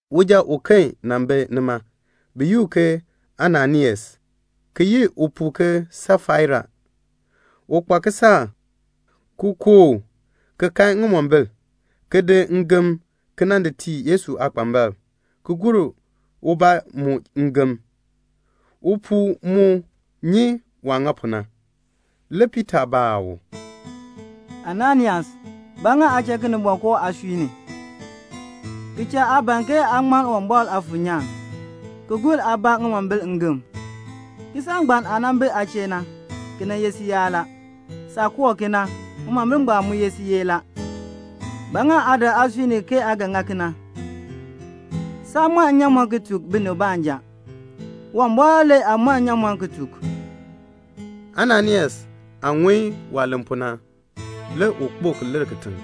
Uja uken nan bi nima, bi yi u ke Ananias, ki yi upuu ke Safaira. U kpa kisaak, ki kooh, ki kan ŋimombil, ki di ngem ki nan di tii Yesu aakpambalb, ki gur ubaa mu ngem. Upuu mu nyi waah ŋa pu na. Le Piita baa u, "Ananias, ba ŋa aa cha Kinimbɔŋ koo aasui ni, ki cha aa ban ke aa ŋmann Uwumbɔr Aafuur nyaan, ki gur aabaa ŋimombil ngem? Kisaak ngbaan aah nan bi aa chee na, ki nan ye siyaan la. Saah kooh ki na, ŋimombil ngbaan mu ye siyee la. Ba ŋa aa dak aasui ni ke aa ga ŋa kena? Saa mɔn nnyaamɔn ki tuk binib baanja. Uwumbɔr le aa mɔn nnyaamɔn ki tuk." Ananias aah ŋun waah len pu na, le u kpo ki lir kitiŋ.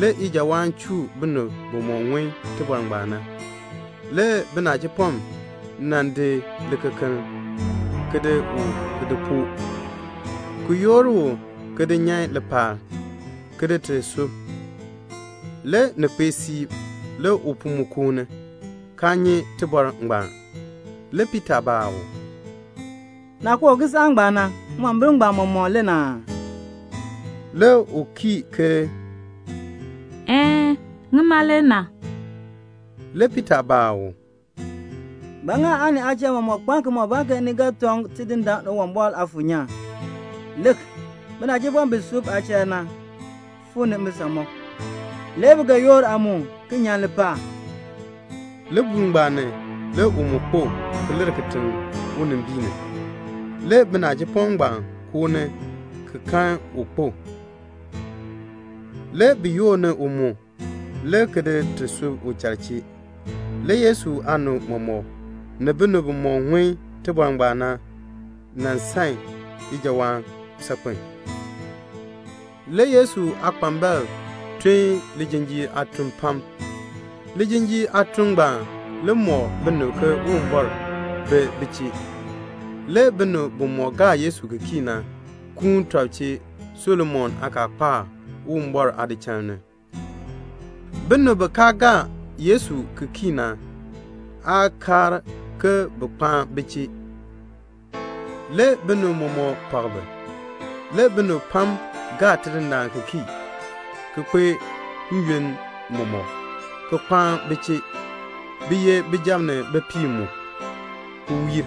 Le ijawaan chuu binib bimɔk ŋun tibɔr ngbaan na. Le binachipɔm nan di likekeln, ki di u ki di poo, ki yoor u ki di nyan lipaal, ki ti di sub. Le ni kpee siib, le upuu mu koo ni, kaa nyi tibɔr ngbaan. Le Piita baa u, "Naah kooh kisaak ngbaan na, ŋimombil ngbaan mɔmɔk le na aa?" Le u kii ke, "Een, ŋima le na." Le Piita baa u, "Ba ŋa aa ni aachal mɔmɔk kpaan kimɔbaan ke ni ga tɔŋ Tidindaan Uwumbɔr Aafuur nyaan? Lik, binachipɔm bi sub aachal na fuu ni mbisamɔb. Le bi ga yoor aa mu, ki nyan lipaal." Libuul ngbaan ni, le u mu kpo, ki lir kitiŋ unimbiin ni. Le binachipɔm ngbaan koo ni ki kan u kpo. Le bi yoor ni u mu, le ki ti di sub uchal chee. Le Yesu aanib mɔmɔk, ni binib bimɔk ŋun tibɔr ngbaan na, bi san ijawaan saakpen a. Le Yesu aakpambalb tun lijinjiir aatun pam. Lijinjiir aatun ngbaan le mɔk binib ke Uwumbɔr bi bi chee. Le binib bimɔk gaa Yesu ki kii na kuun tɔb chee Solomon aakaakpaak, Uwumbɔr aadichal ni. Binib bi kaa gaa Yesu ki kii na aa kaar ke bin kpaan bi chee. Le binib mɔmɔk pak bi. Le binib pam gaa Tidindaan ki kii, ki kpae n-yoonn mɔmɔk, ki kpaan bi chee. Bi ye bijab ni bipiib mu, ki wiir.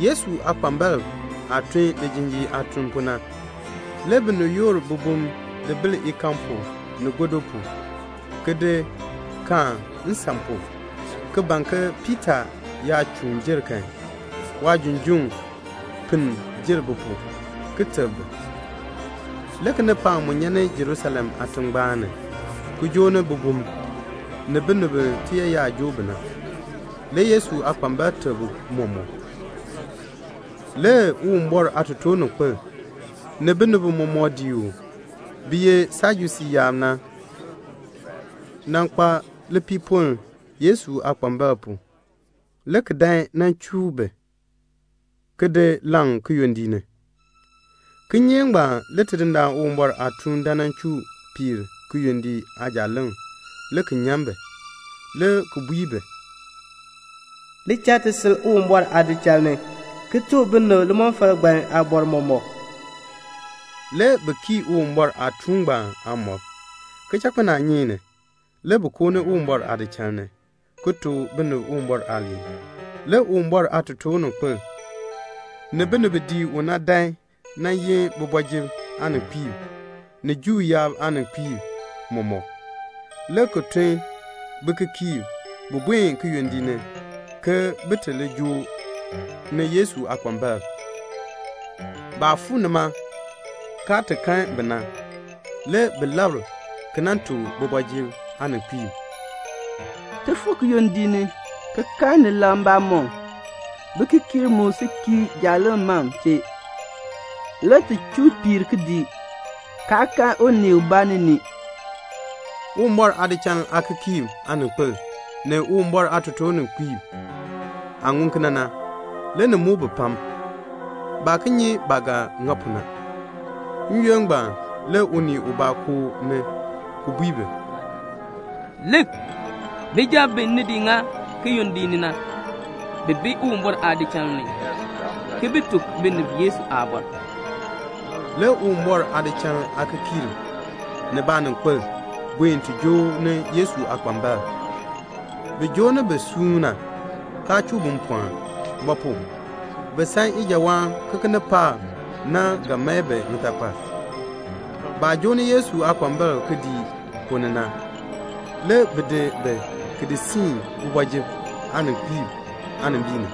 Yesu aakpambalb aah tun lijinjiir aatun pu na, le binib yoor bibum di bil ikaan pu, ni gɔdu pu, ki di kaan nsan pu, ki ban ke Piita yaa chuun jer kan, waajunjuŋ pinn jer bi pu, ki teb bi. Le kinipaak mu nyan ni Jerusalem aatingbaan ni, ki joo ni bibum, ni binib bi tiyaayar joo bi na. Le Yesu aakpambalb teb bi mɔmɔk. Le Uwumbɔr aatotoorninkpil, ni binib bimɔk dii u, bi ye Sajusii yaab na, nan kpa lipiipoln Yesu aakpambalb pu, le ki dan nan chuu bi, ki di laŋ kiyondiik ni. Kinyeek ngbaan le Tidindaan Uwumbɔr aatuun dan nan chuu piir kiyondiik aajaaleŋ, le ki nyan bi, le ki bui bi, "Li cha ti sil Uwumbɔr aadichal ni, ki tuk binib limɔfal ngbaan aabɔr mɔmɔk." Le bi kii Uwumbɔr aatuun ngbaan aamɔb. Kichakpinaanyeek ni, le bi koo ni Uwumbɔr aadichal ni, ki tuk binib Uwumbɔr aaliin. Le Uwumbɔr aatotoorninkpil, ni binib bi dii u na dan nan yin kooti ni aaninkpiib, ni Juu yaab aaninkpiib mɔmɔk, le ki tun bikikiirb, bin buen kiyondiik ni ke bin ti li joo ni Yesu aakpambalb. Baah fuu nima kaa ti kan bi na, le bi labr ki nan tuk kooti ni aaninkpiib, "Ti fuu kiyondiik ni, ki kan ni laŋ mbamɔm. Bikikiirb mu si kii jaaleŋ mam chee. Le ti chuu piir kidiik, kaa kan unii ubaa ni ni." Uwumbɔr aadichal aakikiirb aaninkpil, ni Uwumbɔr aatotoorninkpiib aah ŋun kena na, le ni muk bi pam. Baa ki nyi baah ga ŋa pu na. N-yoonn ngbaan le unii ubaa koo ni, ki bui bi, "Lik, bijab bi ni di ŋa kiyondiik ni na, bi bi Uwumbɔr aadichal ni, ki bi tuk binib Yesu aabɔr." Le Uwumbɔr aadichal aakikiirb ni baaninkpil buen ti joo ni Yesu aakpambalb. Bi joo ni bi suuna, kaa chuu bi mpɔɔn; ba pu? bi san ijawaan ke kinipaak na ga mae bi ŋitakpal. Baah joo ni Yesu aakpambalb kidiik ponn ni na, le bi di bi ki di siin kooti ni aaninkpiib aanimbiin ni.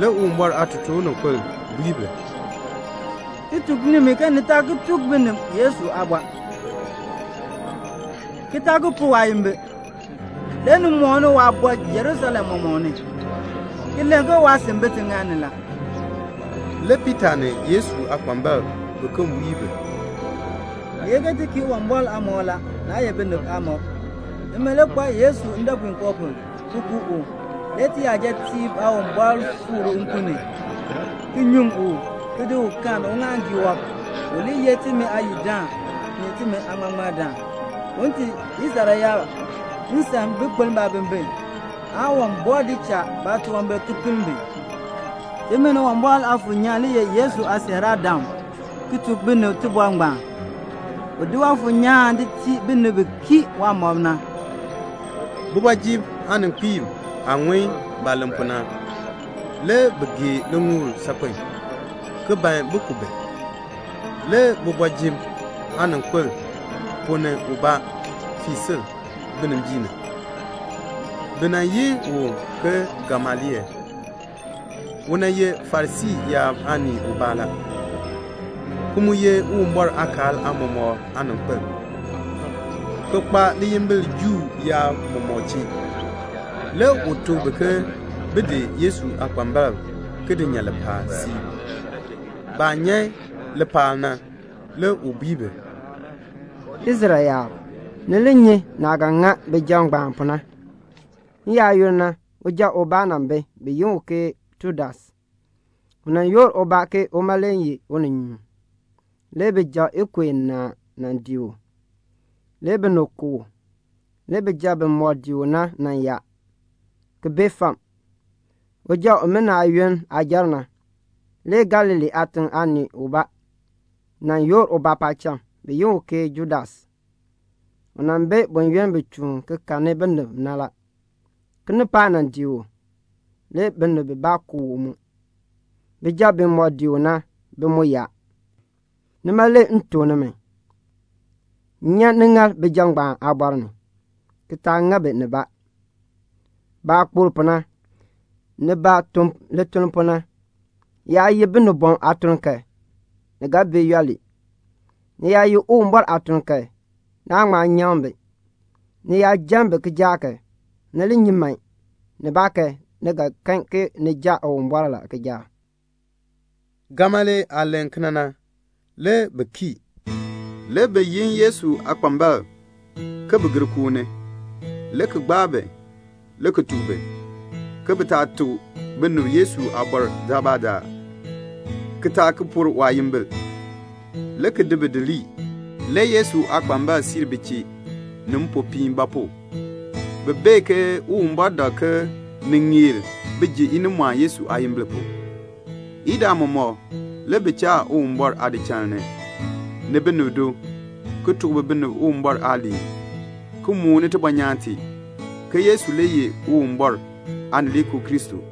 Le Uwumbɔr aatotoorninkpil bui bi, "Ti tuk nimi ke ni taa ki tuk binib Yesu aabɔr, ki taa ki pur waayimbil. Le ni mooni waabɔr Jerusalem mɔmɔk ni, ki len ke waasin bi tiŋaal ni la." Le Piita ni Yesu aakpambalb biken bui bi, "Ni ye ti kii Uwumbɔr aamɔb la, naa ye binib aamɔb. Nimi le kpaa Yesu ndɔpuinkoo pu, ki ku u. Le tiyajatiib Aawumbɔr fikr u nkun ni, ki nyuŋ u, ki di u kaan uŋaaŋgii wɔb, u li ye timi Aayidaan, ni timi Aaŋmardaan, un tii Israel yaab nsan bin kpeln baabimbin, aan Uwumbɔr di cha baatunwambir ki pinn bi. Timi ni Uwumbɔr Aafuur nyaan le ye Yesu aasiiraadam ki tuk binib tibɔr ngbaan. U di Waafuur nyaan di tii binib bi kii waamɔb na." Kooti ni aaninkpiib aah ŋun baah len pu na, le bi gee liŋuul saakpen, ki ban bin ku bi. Le kooti ni aaninkpil ubaa fii sil binimbiin ni. Bi yi u ke Gamaliel. U ye Farisii yaab aanii ubaa la, ki mu ye Uwumbɔr aakaal aamɔmɔkb aaninkpil, ki kpa liyimbil Juu yaab mɔmɔk chee. Le u tuk bi ke bin di Yesu aakpambalb ki di nyan lipaal siib. Baah nyan lipaal na, le u bui bi, "Israel yaab, ni li nyi naah ga ŋa bijab ngbaan pu na. N-yaayoonn na, uja ubaa nan bi, bi yi u ke Tudas. U nan yoor ubaa ke uma le ye uninyuun. Le bijab ikub inaa nan dii u. Le binib ku u. Le bijab bimɔk dii u na nan yaa, ki bee fam. Uja umina aayoonn aah jer na, le Galilee aatiŋ aanii ubaa nan yoor ubaa paacham, bi yi u ke Judas. U nan bi buyoonn bi chuun ki kahni binib na. Kinipaak nan dii u. Le binib bibaa ku u mu. Bijab bimɔk dii u na, bi mu yaa. Nima le m tuk nimi, nyan niŋaal bijab ngbaan aabɔr ni, ki taa ŋa bi nibaa. Baah kpokl pu na, ni baah tun lituln pu na, yaa ye binibɔm aatuln kan, li ga bee yooli. Ni yaa ye Uwumbɔr aatuln kan, naan ŋma nyaŋ bi. Ni yaa jan bi kijaak kan, ni li nyi man, nibaakan ni ga kan ke ni jan Uwumbɔr le kijaak." Gamaliel aah len pu na, le bi kii. Le bi yin Yesu aakpambalb, ke bin gir koo ni, le ki gbaa bi, le ki tuk bi ke bi taa ki tuk binib Yesu aabɔr daalbaadaal, ki taa ki pur waayimbil, le ki di bi di lii. Le Yesu aakpambalb siir bi chee, ni mpopiin; ba pu? bi bee ke Uwumbɔr dak ke bi ŋeer bin ji inimɔɔn Yesu aayimbil pu. Idaa mɔmɔk le bi cha Uwumbɔr aadichal ni, ni binib do, ki tuk binib Uwumbɔr aaliin ki mooni tibɔnyaan tee, ke Yesu le ye Uwumbɔr Aanileekoo Kristo.